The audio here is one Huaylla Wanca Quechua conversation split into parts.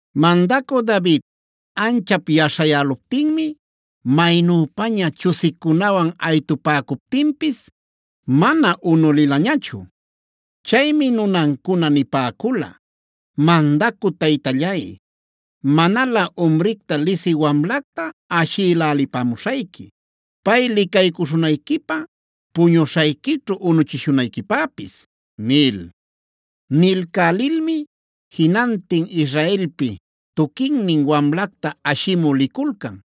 Mandacü David anchap yaśhayäluptinmi maynüpaña chusicunawan aytupäcuptinpis mana unulilañachu. Chaymi nunancuna nipäcula: “Mandacü taytallay, manalä umricta lisï wamlacta ashïlälipamuśhayqui; pay licaycuśhunayquipä, puñuśhayquićhu unuchishunayquipäpis” nil. Nilcälilmi jinantin Israelpi tuquinnin wamlacta ashimü liculcan.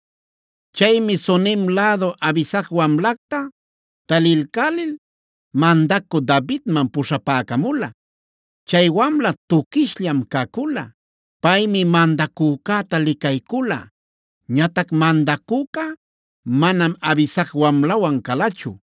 Chaymi Sunem lädu Abisag wamlacta talilcälil mandacü Davidman puśhapäcamula. Chay wamla tuquishllam cacula. Paymi mandacücäta licaycula. Ñatac mandacüca manam Abisag wamlawan calachu.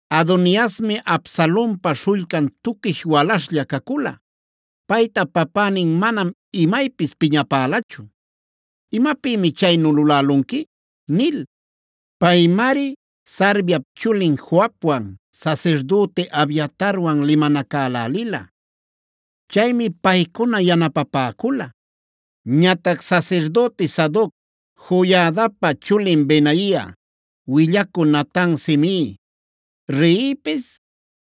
Adoniasmi Absalonpa śhullcan tuquish walaśhlla cacula. Payta papänin manam imaypis piñapälachu: “¿Imapïmi chaynu lulälunqui?” nil. Paymari Sarviap chulin Joabwan, sasirdüti Abiatarwan limanacälälila. Chaymi paycuna yanapapäcula. Ñatac sasirdüti Sadoc, Joiadapa chulin Benaia, willacü Natan, Simei, Reipis,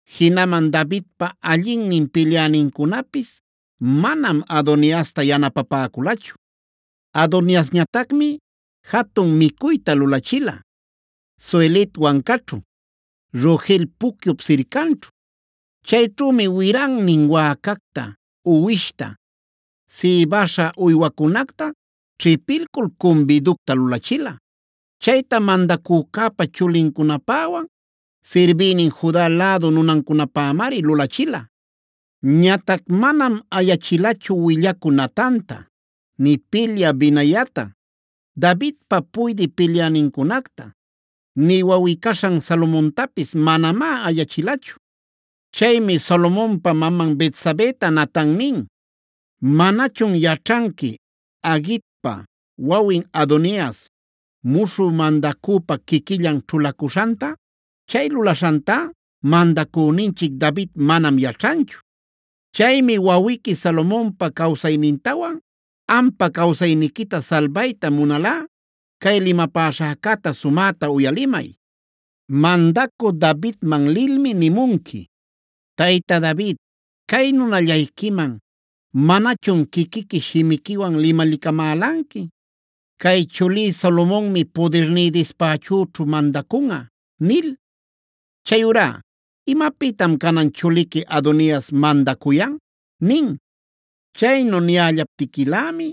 jinaman Davidpa allinnin pilyänincunapis manam Adoniasta yanapapäculachu. Adoniasñatacmi jatun micuyta lulachila Zohelet wancaćhu, Rogel pucyup sircanćhu. Chayćhümi wirannin wäcacta, uwishta, sïbäśha uywacunacta ćhipilcul cumbiducta lulachila. Chayta mandacücäpa chulincunapäwan sirbïnin Juda lädu nunancunapämari lulachila. Ñatac manam ayachilachu willacü Natanta, nï pilyä Benaiata, Davidpa puydï pilyänincunacta, nï wawꞌi-caśhan Salomontapis manamá ayachilachu. Chaymi Salomonpab maman Betsabeta Natan nin: “¿Manachun yaćhanqui Haguitpa wawin Adonias muśhü mandacüpa quiquillan ćhulacuśhanta? Chay lulaśhantá mandacüninchic David manam yaćhanchu. Chaymi wawiqui Salomonpa cawsaynintawan ampa cawsayniquita salbayta munalꞌa cay limapäśhäcäta sumäta uyalimay. Mandacü Davidman lilmi nimunqui: ‘Tayta David, cay nunallayquiman ¿manachun quiquiqui shimiquiwan limalicamälanqui: “Cay chulí Salomonmi pudirní dispächüćhu mandacunꞌa” nil? Chayurá ¿imapïtam canan chuliqui Adonias mandacuyan?’ nin. Chaynu niyällaptiquilämi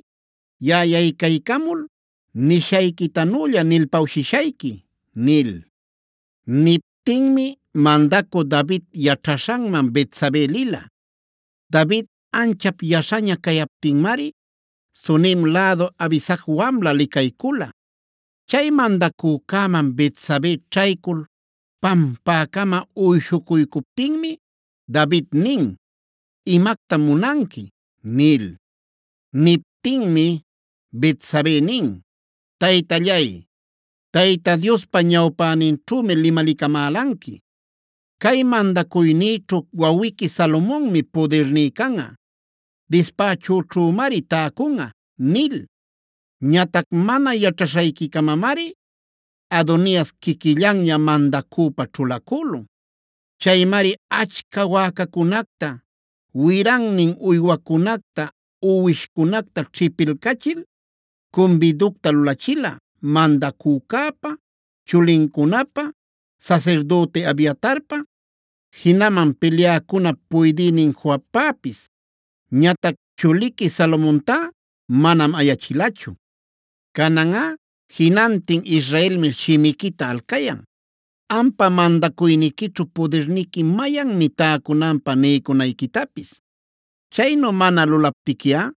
yaꞌa yaycaycamul nishayquitanülla nilpawshishayqui” nil. Niptinmi mandacü David yaćhaśhanman Betsabe lila. David anchap yaśhaña cayaptinmari Sunem lädu Abisag wamla licaycula. Chay mandacücäman Betsabe ćhaycul pampäcama uyshucuycuptinmi David nin: “¿Imactam munanqui?” nil. Niptinmi Betsabe nin: “Taytallay, Tayta Diospa ñawpäninćhümi limalicamälanqui: ‘Cay mandacuynïćhu wawiqui Salomonmi pudirní canꞌa, dispächüćhümari täcunꞌa’ nil. Ñatac mana yaćhaśhayquicamamari Adonias quiquillanña mandacüpa ćhulacülun. Chaymari achca wäcacunacta, wirannin uywacunacta, uwishcunacta ćhipilcachil cumbiducta lulachila mandacücäpa, chulincunapä, sasirdüti Abiatarpa, jinaman pilyäcunap puydïnin Joabpäpis. Ñatac chuliqui Salomontá manam ayachilachu. Cananꞌa jinantin Israelmi shimiquitac alcayan ampa mandacuyniquićhu pudirniqui mayannin täcunanpä niycunayquitapis. Chaynu mana lulaptiquiꞌa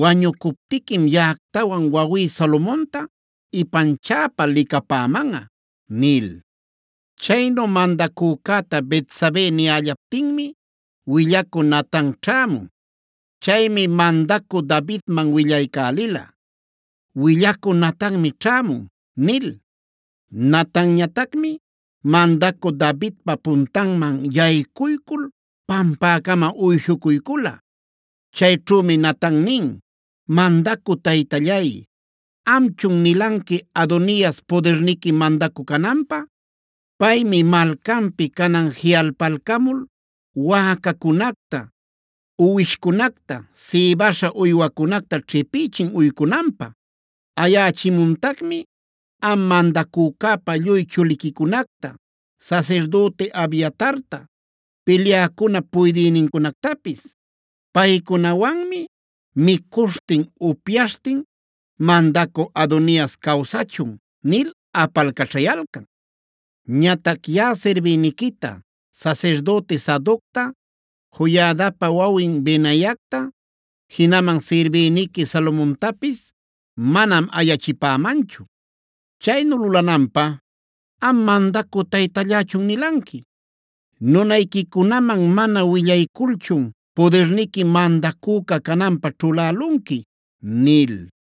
wañucuptiquim yaꞌactawan wawí Salomonta ipanchäpa licapämanꞌa” nil. Chaynu mandacücäta Betsabe niyällaptinmi willacü Natan ćhämun. Chaymi mandacü Davidman willaycälila: “Willacü Natanmi ćhämun” nil. Natanñatacmi mandacü Davidpa puntanman yaycuycul pampäcama uyshucuycula. Chayćhümi Natan nin: “Mandacü taytallay, ¿amchun nilanqui Adonias pudirniqui mandacü cananpä? Paymi malcanpi canan jiꞌalpalcamul wäcacunacta, uwishcunacta sïbäśha uywacunacta ćhipïchin uycunanpä. Ayächimuntacmi am mandacücäpa lluy chuliquicunacta, sasirdüti Abiatarta, pilyäcunap puydïnincunactapis. Paycunawanmi micuśhtin upyaśhtin: ‘¡Mandacü Adonias cawsachun!’ nil apalcaćhayalcan. Ñatac yaꞌa sirbïniquita, sasirdüti Sadocta, Joiadapa wawin Benaiacta, jinaman sirbïniqui Salomontapis manam ayachipämanchu. Chaynu lulananpä ¿am mandacü taytallächun nilanqui? ¿Nunayquicunaman mana willayculchun pudirniqui mandacüca cananpä ćhulälunqui?” nil.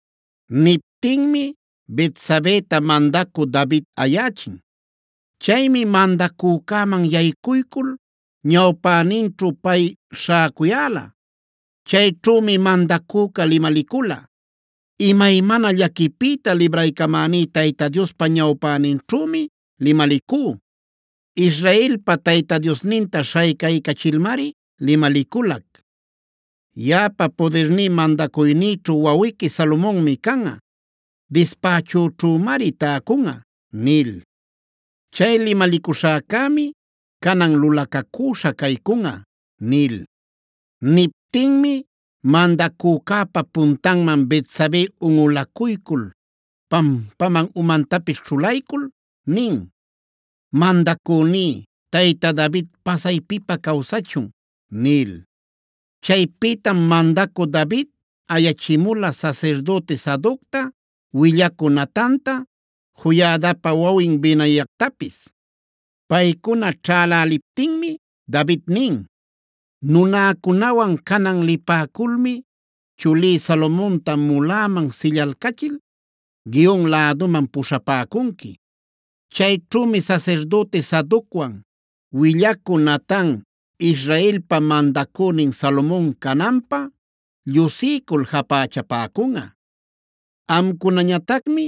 Niptinmi Betsabeta mandacü David ayächin. Chaymi mandacücäman yaycuycul ñawpäninćhu pay śhäcuyäla. Chayćhümi mandacüca limalicula: “Imaymana llaquipïta libraycamäní Tayta Diospa ñawpäninćhümi limalicú. Israelpa Tayta Diosninta śhaycaycachilmari limaliculac: ‘Yaꞌapa pudirní mandacuynïćhu wawiqui Salomonmi canꞌa; dispächüćhümari täcunꞌa’ nil. Chay limalicuśhäcämi canan lulacacüśhad caycunꞌa” nil. Niptinmi mandacücäpa puntanman Betsabe unꞌulacuycul pampaman umantapis ćhulaycul nin: “Mandacüní tayta David pasaypipä cawsachun” nil. Chaypïtam mandacü David ayachimula sasirdüti Sadocta, willacü Natanta, Joiadapa wawin Benaiactapis. Paycuna ćhälaliptinmi David nin: “Nunäcunawan canan lipäculmi chulí Salomonta muläman sillalcachil Gihon läduman puśhapäcunqui. Chayćhümi sasirdüti Sadocwan, willacü Natan Israelpa mandacünin Salomon cananpä llushiycul japächapäcunꞌa. Amcunañatacmi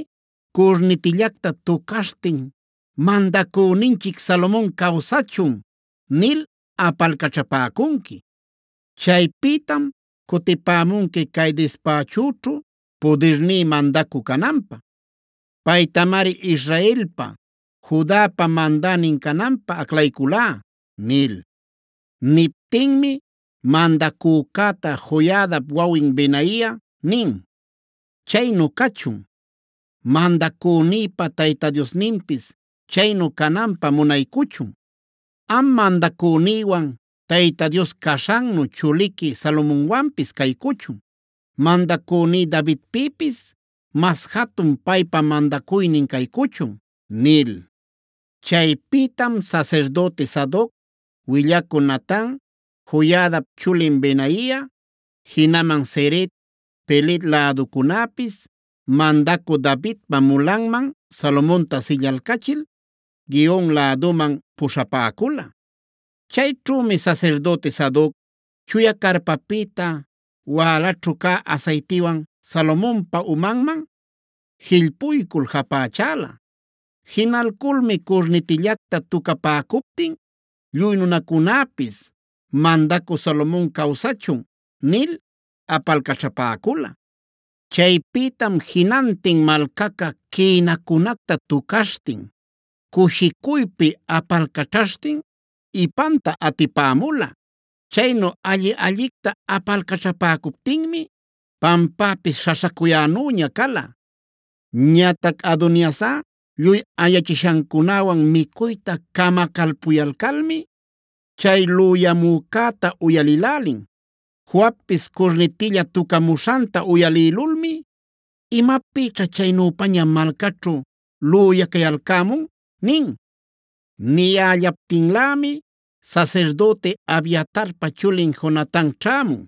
curnitillacta tucaśhtin ‘¡Mandacüninchic Salomon cawsachun!’ nil apalcaćhapäcunqui. Chaypïtam cutipämunqui cay dispächüćhu pudirní mandacü cananpä. Paytamari Israelpa, Judapa mandänin cananpä aclayculá” nil. Niptinmi mandacücäta Joiadap wawin Benaia nin: “Chaynu cachun. Mandacünïpa Tayta Diosninpis chaynu cananpä munaycuchun. Am mandacünïwan Tayta Dios caśhannu chuliqui Salomonwanpis caycuchun. Mandacüní Davidpïpis mas jatun paypa mandacuynin caycuchun” nil. Chaypïtam sasirdüti Sadoc, willacü Natan, Joiadap chulin Benaia, jinaman Ceret, Pelet läducunäpis mandacü Davidpa mulanman Salomonta sillalcachil Gihon läduman puśhapäcula. Chayćhümi sasirdüti Sadoc chuya carpapïta wälaćhu cä asaytiwan Salomonpa umanman jillpuycul japächala. Jinalculmi curnitillacta tucapäcuptin lluy nunacunäpis: “Mandacü Salomon cawsachun” nil apalcaćhapäcula. Chaypïtam jinantin malcaca quïnacunacta tucaśhtin, cushicuypi apalcaćhaśhtin ipanta atipämula. Chaynu alli-allicta apalcaćhapäcuptinmi pampäpis śhaśhacuyänüña cala. Ñatac Adoniasꞌa lluy ayachishancunäwan micuyta camacalpuyalcalmi chay lüyamücäta uyalïlälin. Joabpis curnitilla tucamuśhanta uyalïlulmi: “Imapïćha chaynüpaña malcaćhu lüyacayalcämun” nin. Niyällaptinlämi sasirdüti Abiatarpa chulin Jonatan ćhämun.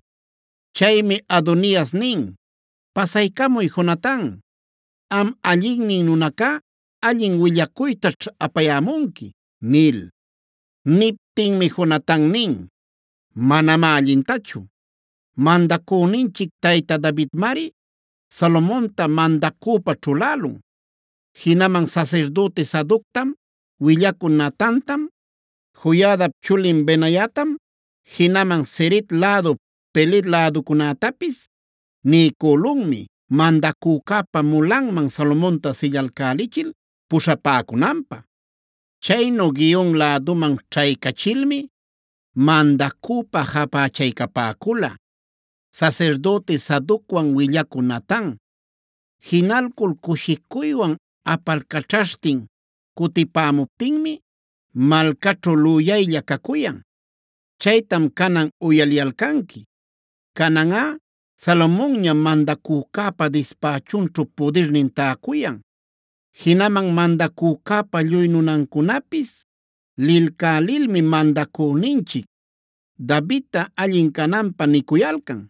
Chaymi Adonias nin: “Pasaycamuy Jonatan; am allinnin nunacá allin willacuytaćh apayämunqui” nil. Niptinmi Jonatan nin: “Manamá allintachu. Mandacüninchic tayta Davidmari Salomonta mandacüpä ćhulälun. Jinaman Sasirdüti Sadoctam, willacü Natantam, Joiadap chulin Benaiatam, jinaman Ceret lädu Pelet läducunätapis niycülunmi mandacücäpa mulanman Salomonta sillalcälichil puśhapäcunanpä. Chaynu Gihon läduman ćhaycachilmi mandacüpa japächaycapäcula sasirdüti Sadocwan willacü Natan. Jinalcul cushicuywan apalcaćhaśhtin cutipämuptinmi malcaćhu lüyaylla cacuyan. Chaytam canan uyaliyalcanqui. Cananꞌa Salomonñam mandacücäpa dispächunćhu pudirnin täcuyan. Jinaman mandacücäpa lluy nunancunapis lilcälilmi mandacüninchic Davidta allin cananpä nicuyalcan: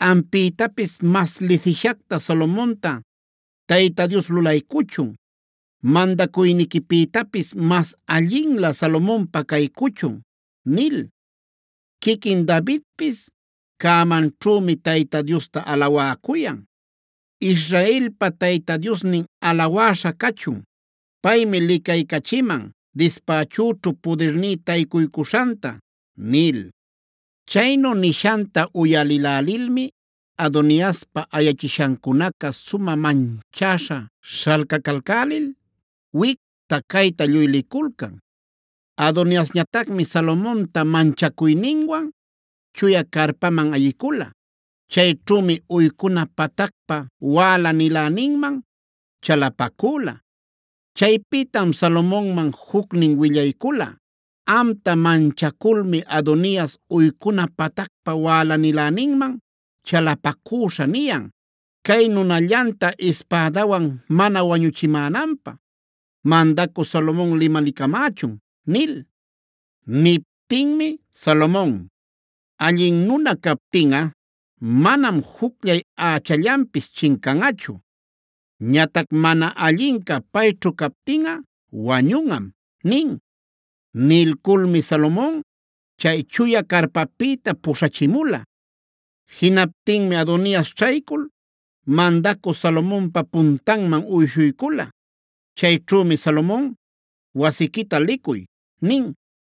‘Ampïtapis mas lisishacta Salomonta Tayta Dios lulaycuchun. Mandacuyniquipïtapis mas allinlä Salomonpä caycuchun’ nil. Quiquin Davidpis cämanćhümi Tayta Diosta alawäcuyan: ‘Israelpa Tayta Diosnin alawäśha cachun. Paymi licaycachiman dispächüćhu pudirní taycuycuśhanta’” nil. Chaynu nishanta uyalïlälilmi Adoniaspa ayachishancunaca sumä manchäśha śhalcacalcälil wicta-cayta lluy liculcan. Adoniasñatacmi Salomonta manchacuyninwan chuya carpaman ayicula. Chayćhümi uycuna patacpa wäla-niläninman chalapacüla. Chaypïtam Salomonman jucnin willaycula: “Amta manchaculmi Adonias uycuna patacpa wälaniläninman chalapacüśha niyan: ‘Cay nunallanta ispädawan mana wañuchimänanpä mandacü Salomon limalicamächun’” nil. Niptinmi Salomon: “Allin nuna captinꞌa manam jucllay ächallanpis chincanꞌachu. Ñatac mana allinca payćhu captinꞌa wañunꞌam” nin. Nilculmi Salomon chay chuya carpapïta puśhachimula. Jinaptinmi Adonias ćhaycul mandacü Salomonpa puntanman uyshuycula. Chayćhümi Salomon: “Wasiquita licuy” nin.